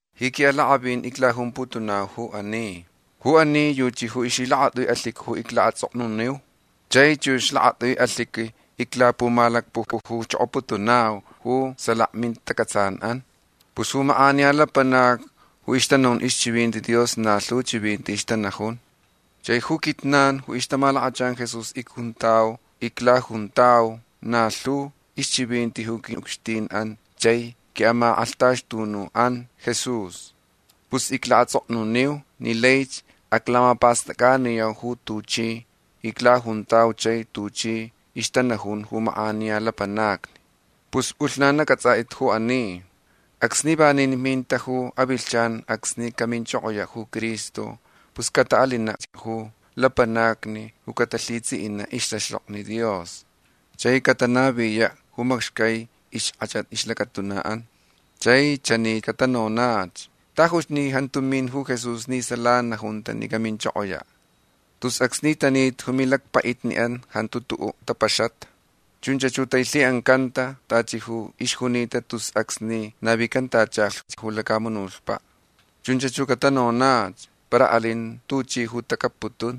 Ji quiʼalakʼavin iclajumputunau ju ani. Ju ani yuchi ju ixlhilakatʼui alhiqui ju iclaʼatsʼoknuniu. Chai chux lakatʼui alhiqui iclapumalacpucujuchokoputunau ju salaka mintacʼatsanʼan. Pus ju makʼaniya lapanacni ju ixtanajun ixchivinti Dios na lhu chivinti ixtanajun. Chai ju quijnan ju ixtamalakachan Jesús icjuntau iclajuntau na lhu ixchivinti ju quiʼucxtinʼan chai quiʼamakʼalhtaxtunuʼan Jesús. Pus iclaʼatsʼoknuniu ni laich aclamapastʼacʼaniyau ju tuchi iclajuntau chai tuchi ixtanajun ju makʼaniya lapanacni. Pus pʼulhnan acʼatsʼatʼit ju ani. Acsni vanin minta ju avilhchan acsni caminchokoyaʼ ju Cristo pus cataʼalinach ju lapanacni ju catalhitsʼiʼinaʼ ixtaxtokni Dios. Chai catanaviyaʼ ju macxcai ixkʼachat ixlacatunaʼan. Chai chani catanonach: “Tajuch ni jantuch min ju Jesús ni sala najunta ni caminchokoyaʼ. Tus acsni tanita ju milacpaʼitniʼan jantu tuʼuʼ tapaxata. Chunch ju tailhiʼancanta tachi ju ixjunita tus acsni navicantachalhch ju lacamunutpaʼ”. Chunch ju catanonach. Para alin tuchi ju tacapputun.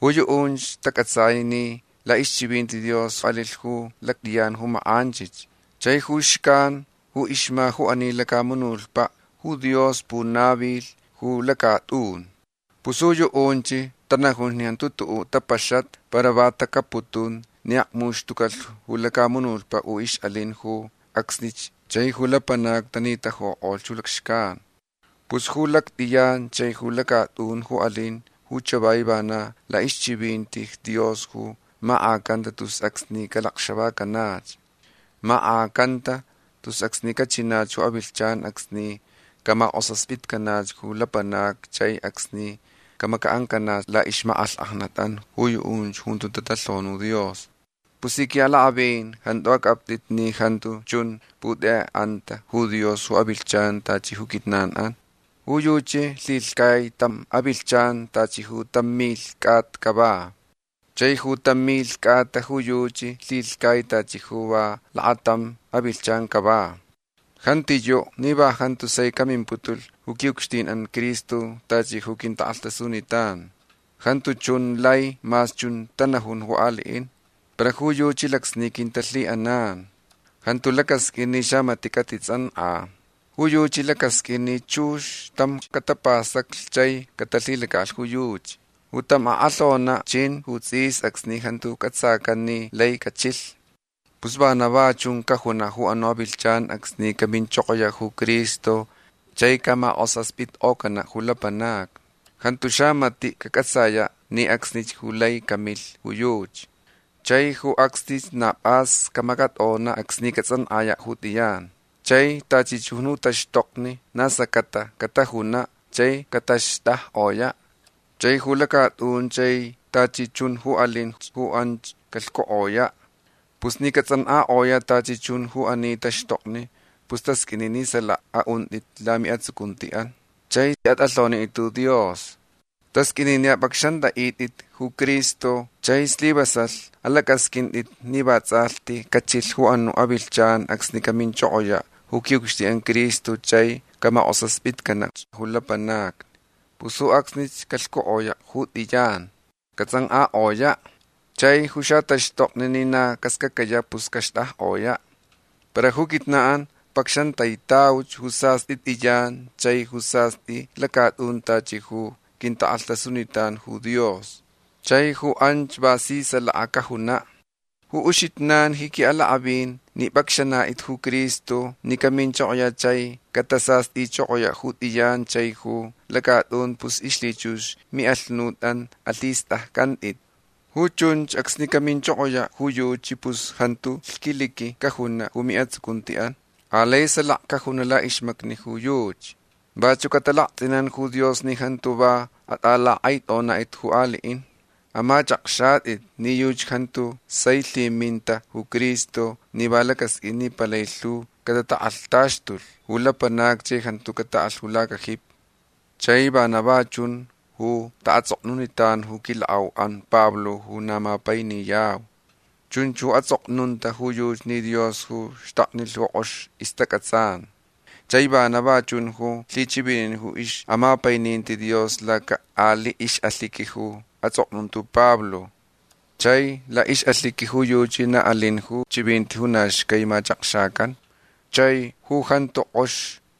Ju yuʼunch tacʼatsai ni laʼixchivinti Dios alilh ju lactʼiyan ju makʼanchich. Chai ju xcan ju ixma ju ani lacamunutpaʼ ju Dios punavilh ju lacatʼun. Pus ju yuʼunch tanajun ni jantu tuʼuʼ tapaxata para va tacapputun ni akmuxtucalh ju lacamunutpaʼ ju ixʼalin ju acsnich chai ju lapanacni tanitajukʼolh ju lacxcan. Pus ju lactʼiyan chai ju lacatʼun ju alin ju chavai vana laʼixchivinti Dios ju makʼacanta tus acsni calacxavacanach. Makʼacanta tus acsni cachinach ju avilhchan acsni camakʼosaspitcanach ju lapanacni chai acsni camacaʼancanaʼ laʼixmakʼalhkʼajnatʼan ju yuʼunch ju jantu tatalhoni ju Dios. Pus ji quiʼalakʼavin jantu acʼaptʼit ni jantu chun putekʼeʼanta ju Dios ju avilhchan tachi ju quijnanʼan. Ju yuchi lhilhcai tam avilhchan tachi ju tam milh cʼata cava. Chai ju tam milh cʼata ju yuchi lhilhcai tachi ju va lakatam avilhchan cava. Jantiyuʼ ni va jantu sai camimputulh ju quiʼucxtinʼan Cristo tachi ju quintakʼalhtasunitan. Jantu chun lai mas chun tanajun ju aliʼin. Para ju yuchi lacsni quintalhiʼanan. Jantu lacasqʼuin ni xamatiʼ catitsʼankʼa. Ju yuchi lacasqʼuin ni chux tamch catapastaclh chai catalhilacaʼalh ju yuchi. Ju tam akʼalhonaʼ chin ju tsʼis acsni jantu cʼatsacan ni lai cachilh. Pus vana va chun cajunaʼ ju anuʼ avilhchan acsni caminchokoyaʼ ju Cristo chai caʼamakʼosaspitkʼocanaʼ ju lapanacni. Jantu xamatiʼ cacʼatsayaʼ ni acsnich ju lai camilh ju yuchi. Chai ju acsnich na pʼas camacatʼonaʼ acsni catsʼankʼayaʼ ju tʼiyan. Chai tachi chun ju taxtokni na scacata catajunaʼ chai cataxtʼajkʼoyaʼ. Chai ju lacatʼun chai tachi chun ju alinch ju anch calhcukʼoyaʼ. Pus ni catsʼankʼakʼoyaʼ tachi chun ju ani taxtokni pus tasqʼuini ni salaka aʼuntʼit lamiʼatsucuntiʼan. Chai atʼalhonitʼit ju Dios. Tasqʼuini ni apʼacxantʼaʼitʼit ju Cristo chai slivasalh alacʼasqʼuintʼit ni vatsʼalhti cachilh ju anuʼ avilhchan acsni caminchokoyaʼ ju quiʼucxtinʼan Cristo chai caʼamakʼosaspitcanach ju lapanacni. Pus ju acsnich calhcukʼoyaʼ ju tʼiyan. Catsʼankʼakʼoyaʼ. Chai ju xataxtokni ni na cascacayaʼ pus caxtʼajkʼoyaʼ. Para ju quijnanʼan pacxantaitauch ju sastʼi tʼiyan chai ju sastʼi lacatʼun tachi ju quintakʼalhtasunitan ju Dios. Chai ju anch va si salaka cajunaʼ. Ju uxijnan ji quiʼalakʼavin ni pʼacxanatʼit ju Cristo ni caminchokoyaʼ chai catasastʼichokoyaʼ ju tʼiyan chai ju lacatʼun pus ixlhichux miʼalhunutʼan alhistʼaccʼantʼit. Ju chunch acsni caminchokoyaʼ ju yuchi pus jantu lhquiliqui cajunaʼ ju miʼatsucuntiʼan. Alai salaka cajunaʼ laʼixmacni ju yuchi. Vachuʼ catalaktsʼinan ju Dios ni jantu va atʼalakʼaitʼonatʼit ju aliʼin. Amachʼakxatʼit ni yuchi jantu sai lhiminta ju Cristo ni va lacasqʼuin ni palai lhu catatakʼalhtaxtulh ju lapanacni chai jantu cataʼalh ju lacajipi. Chai vana va chun ju taʼatsʼoknunitan ju quilakʼauʼan Pablo ju na mapainiyau. Chunch ju atsʼoknunta ju yuchi ni Dios ju xtaknilh ju kʼox ixtacʼatsan. Chai vana va chun ju lhichivinin ju ixʼamapaininti Dios laca aliʼ ixʼalhiqui ju atsʼoknunta ju Pablo. Chai laʼixʼalhiqui ju yuchi na alin ju chivinti ju na xcai machakxacan. Chai ju jantu kʼox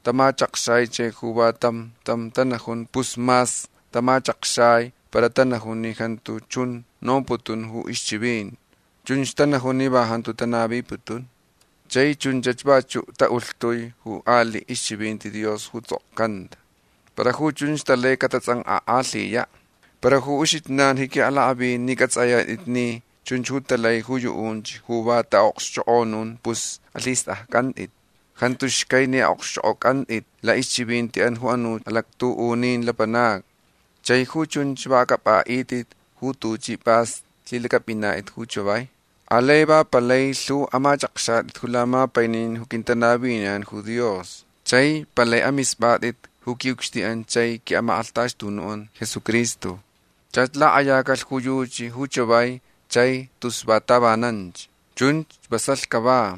tamachakxai chai ju va tam tam tanajun pus mas tamachakxai para tanajun ni jantu chun nomputun ju ixchivinti. Chunch tanajun ni va jantu tanaviputun. Chai chunch vachuʼ taʼulhtui ju aliʼ ixchivinti Dios ju tsʼokcanta. Para ju chunch talai catatsʼankʼakʼalhiyaʼ. Para ju uxijnan ji quiʼalakʼavin ni cʼatsʼayatʼit ni chunch ju talai ju yuʼunch ju va taʼaʼokxchokʼonun pus alhistʼaccʼantʼit. Jantu xcai ni aʼokxchʼokʼocʼantʼit laʼixchivintiʼan ju anuch alactuʼunin lapanacni. Chai ju chunch va acʼapʼaʼitʼit ju tuchi pʼas lhilacʼapʼinatʼit ju chavai. Alai va palai lhu amachʼakxatʼit ju lamapainin ju quintanaviniyan ju Dios. Chai palai amispʼatʼit ju quiʼucxtinʼan chai quiʼamakʼalhtaxtunuʼan Jesucristo. Chach lakʼayacalh ju yuchi ju chavai chai tus va tavananch. Chunch vasalh cava.